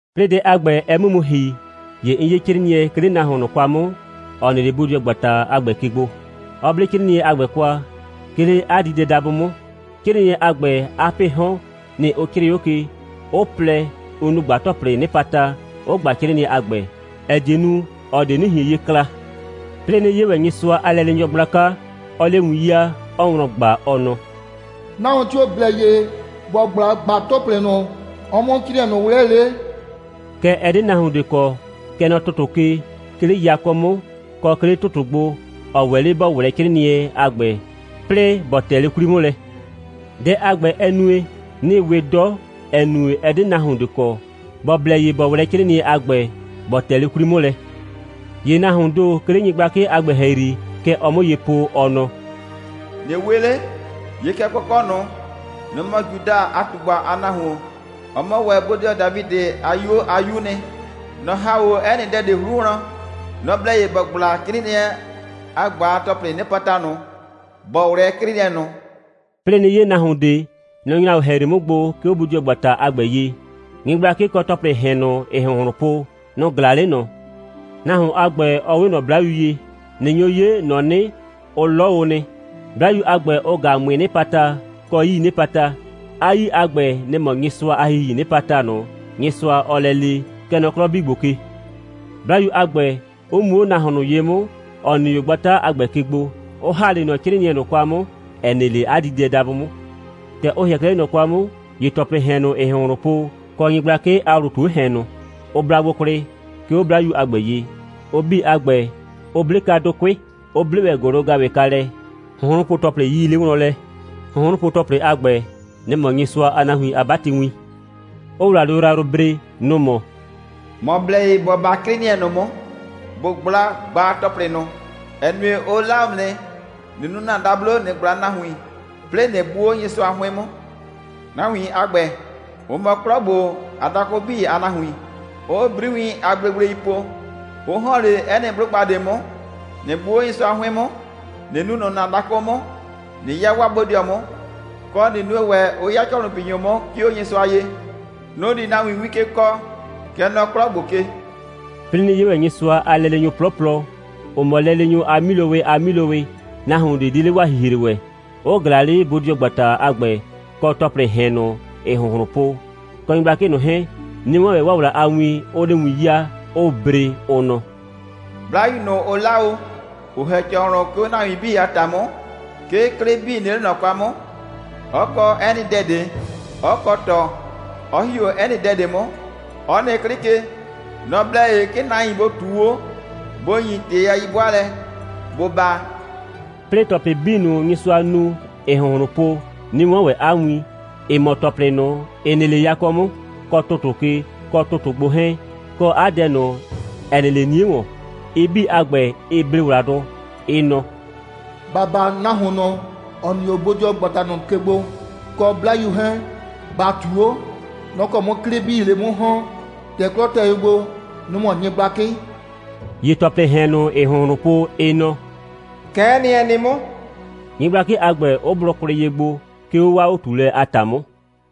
'Plɩɩ dɛ a ‑gbɛ, ɛ 'mʋ mu ‑hi, ‑ye 'n 'ye 'crɩɩnɩɛ, 'ke 'le nahuon ꞊nʋ kwa 'mʋ, ‑ɔ nɩ 'le bodɩɔgbata a ‑gbɛ ke gbo, 'ɔ 'ble 'crɩɩnɩɛ a ‑gbɛ kwa, 'ke 'le 'a diidɛdabʋ 'mʋ. 'Crɩɩnɩɛ a ‑gbɛ, 'a 'pɩɩ 'hɔn, nɩ‑ ʋ 'crɩɩ 'o ke, 'ʋ 'plɛ, 'ʋ nu ꞊gbaa‑tɔplɩɩ 'nɩpata, 'ʋ ꞊gba 'crɩɩnɩɛ a ‑gbɛ, ‑ɛ die nu, ꞊ɔ ꞊de 'nɩ ꞊hien ye kla. 'Plɩɩ 'nɩ 'ye ‑wɛ Nyɩsʋa a lɛleenyɔ gblaka, 'ɔɔ 'le win 'yaa, 'ɔɔ wlɔn ꞊gba, ɔ nɔ: «Nahuon tio‑ blɛ ye ‑bɔ ꞊gbla ꞊gbaa‑tɔplɩ ꞊nʋ, ɔ 'mʋ 'crɩɩnɩɛ ꞊nʋ ꞊wlɛɛ 'le?» Kɛɛ, ɛ 'de nahuon ꞊de kɔ, kɛ nɔ ‑tʋtʋ ke, 'ke 'le yakɔ 'mʋ, kɔ 'ke 'le ‑tʋtʋ gbo, ‑ɔ ‑wɛ 'le ‑bɔ ꞊wlɛɛ 'crɩɩnɩɛ a ‑gbɛ, 'plɩɩ ‑bɔ tɛ 'le 'kwli 'mʋ lɛ. Dɛ a ‑gbɛ, ɛ nue, 'nɩ we 'dɔ, ‑ɛ nue, ɛ 'de nahuon ꞊de kɔ, ‑bɔ blɛ ye ‑bɔ ꞊wlɛɛ 'crɩɩnɩɛ a ‑gbɛ, ‑bɔ ‑tɛ 'le 'kwli 'mʋ lɛ. ‑Ye nahuoon ‑do, 'ke 'le nyɩgblakɩ a ‑gbɛ ‑hɛyri, kɛ ɔɔ 'mʋ ye po, ɔ nɔ: «꞊Nɩ we 'le. 'Ye kɛ kɔkɔ' ꞊nʋ. Nɔ‑ mɔ Juda a ꞊tugba a nahuon. Ɔ mɔ ‑wɛ bodɩɔ Dafidɩ a 'yuo a 'yuu nɩ. Nɔ‑ ‑ha 'o 'ɛ nɩ dɛ ꞊de 'hru wlɔn. Nɔ‑ blɛ ye ‑bɔ ꞊gbla 'crɩɩnɩɛ a ꞊gbaa‑tɔplɩɩ 'nɩpata ꞊nʋ, ‑bɔ ꞊wlɛɛ 'crɩɩnɩɛ ꞊nʋ.» 'Plɩɩ 'nɩ 'ye nahuon ꞊de. Nɔ‑ nyra 'o ‑hɛyri 'mʋ gbo, 'ke 'o bodɩɔgbata a ‑gbɛ ye. Nyɩgblakɩ kɔ ‑tɔplɩɩ ‑hɛn ꞊nʋ, ‑ɩɩ ‑hʋnhlʋn po, nʋ‑ ꞊glaa 'le ꞊nɔ. Nahuon a ‑gbɛ, ɔ 'we ꞊nɔ 'blayu ye. ꞊Nɩ nyo 'ye, ‑nɔ 'nɩ, ʋ 'lɔ o nɩ, 'Blayu a ‑gbɛ 'ʋ ꞊gaa ꞊mʋɩɩ 'nɩpata kɔ 'yii 'nɩpata. 'A 'yii a ‑gbɛ, nɩ‑ mɔ Nyɩsʋa a ‑Hihii 'nɩpata ꞊nʋ, Nyɩsʋa, ɔɔ lɛ le, kɛ nɔ 'klɔ 'bii ‑gbo ke; 'Blayu a ‑gbɛ 'ʋ mu 'o nahuon ꞊nʋ ye 'mʋ, ‑ɔ nɩ 'o gbata a ‑gbɛ ke gbo, 'ʋ ‑ha 'le ꞊nɔ 'crɩɩnɩɛ ꞊nʋ kwa 'mʋ, ‑ɛ nɩ 'le 'a diidɛdabʋ 'mʋ. ‑Tɛ ʋ ‑hɩɛ 'klɛɛ 'le ꞊nɔ kwa 'mʋ, ‑ye ‑tɔplɩɩ ‑hɛn ꞊nʋ, ‑ɩɩ ‑hʋnhlʋn po, kɔ nyɩgblakɩ a ‑wlʋ ꞊tu 'o ‑hɛn ꞊nʋ, ʋ bla gbo kwlɩ, 'ke 'o 'Blayu a ‑gbɛ ye. Ʋ 'bii a ‑gbɛ, ʋ 'ble kwa dʋkʋɩ', 'ʋ 'ble ‑wɛ ‑gʋlʋ‑gaʋwɩ kwa lɛ, hʋnhrʋnpo‑tɔplɩ 'yii 'le wlɔn lɛ. Hʋnhrʋnpo‑tɔplɩ a ‑gbɛ, nɩ‑ mɔ Nyɩsʋa a nahuin a 'batɩwin; 'ʋʋ ‑wladʋ yrayrʋ bre. Nʋ‑ mɔ: «‑Mɔ blɛ ye ‑bo 'ba 'crɩɩnɩɛ ꞊nʋ 'mʋ, ‑bo ꞊gbla ꞊gbaa‑tɔplɩ ꞊nʋ, ‑ɛ nue, ʋ 'la o ‑mʋ nɩ, ꞊nɩ nu ‑na dablo, ꞊nɩ ꞊gbla nahuin, 'plɩɩ ꞊nɩ gbʋ 'o Nyɩsʋa 'hʋɩn 'mʋ. Nahuin a ‑gbɛ, ʋ mɔ 'klɔ ‑gbo a dakʋ 'bii a nahuin, 'ʋʋ 'briwiin a gblegblei po, 'ʋ ‑hɔn 'le 'ɛ nɩ 'blʋgba ꞊de 'mʋ, ꞊nɩ gbʋ 'o Nyɩsʋa 'hʋɩn 'mʋ, ꞊nɩ nuu ꞊nʋ ‑na dakʋ 'mʋ, ꞊nɩ 'ya 'waa bodɩɔ 'mʋ, kɔ, ꞊nɩ nue ‑wɛ, 'ʋ 'ya ‑cɔhlʋnpinyʋ 'mʋ, 'ke 'o Nyɩsʋa ye. Nʋ‑ di nahuin win ke kɔɔ, kɛ nɔ 'klɔ ‑gbo ke.» 'Plɩɩ 'nɩ 'ye ‑wɛ Nyɩsʋa a lɛleenyʋ 'plɔplɔ, 'ʋ mɔ lɛleenyʋ a 'milowɩ a 'milowɩ, nahuon ꞊de 'de 'le 'waa ‑hihre ‑wɛ; 'ʋ ꞊glaa 'le bodɩɔgbata a ‑gbɛ, kɔ ‑tɔplɩɩ ‑hɛn ꞊nʋ, ‑ɩɩ ‑hʋnhlʋn po, kɔ nyɩgblakɩ ꞊nʋ 'hɛɛn, 'nɩ 'wɔn ‑wɛ 'waa ‑wla a win, 'ʋʋ 'le win 'yaa, 'ʋʋ bre, ʋ nɔ: «'Blayu ꞊nʋ, ʋ 'la o, ‑ʋ ‑hɛ ‑cɔhlʋn, 'ke 'o nahuin a ‑ta 'mʋ, 'ke 'klɩ 'bii nɩ 'le ꞊nɔ kwa 'mʋ, 'ɔ kɔ 'ɛ nɩ dɛ ꞊de, 'ɔ kɔ ꞊tɔ, 'ɔ ‑hi 'o 'ɛ nɩ dɛ ꞊de 'mʋ, 'ɔ nɩ 'klɩ ke. Nɔ‑ blɛ ye, 'ke nahuin bʋ ꞊tuu 'o, bʋ ‑nyi ‑tɩ a 'yi'bʋaalɛ, bʋ baa.» 'Plɩɩ ‑tɔplɩ 'bii ꞊nʋ, Nyɩsʋa nu, ‑ɩɩ ‑hʋnhlʋn po, 'nɩ 'wɔn ‑wɛ 'a win, ‑ɩ mɔ ‑tɔplɩ ꞊nʋ, ‑ɩ nɩ 'le yakɔ 'mʋ, kɔ ‑tʋtʋ ke, kɔ ‑tʋtʋ gbo 'hɛɛn, kɔ 'a dɛ ꞊nʋ, ‑ɛ nɩ 'le 'nie ‑wɔn. Ɩ 'bii a ‑gbɛ, ɩɩ ble ‑wladʋ, ɩ nɔ: «‑Ba baa nahuon ꞊nʋ, ‑ɔ nɩ 'o bodɩɔgbata ꞊nʋ ke gbo, kɔ 'Blayu 'hɛɛn. ‑Ba ꞊tuu 'o. Nʋ‑ kɔ 'mʋ 'klɩ 'bii 'le 'mʋ ‑hɔn. ‑Tɛ 'klɔ tɛ ye gbo, nʋ‑ mɔ nyɩgblakɩ.» ‑Ye ‑tɔplɩɩ ‑hɛn ꞊nʋ, ‑ɩɩ ‑hʋnhlʋn po, ɩ nɔ: «Kɛ'ɛ nɩ, ɛ nɩ 'mʋ,» nyɩgblakɩ a ‑gbɛ 'ʋ blʋ kwlɩ ye gbo, 'ke 'o 'waa 'o꞊tuulɛ a ‑ta 'mʋ.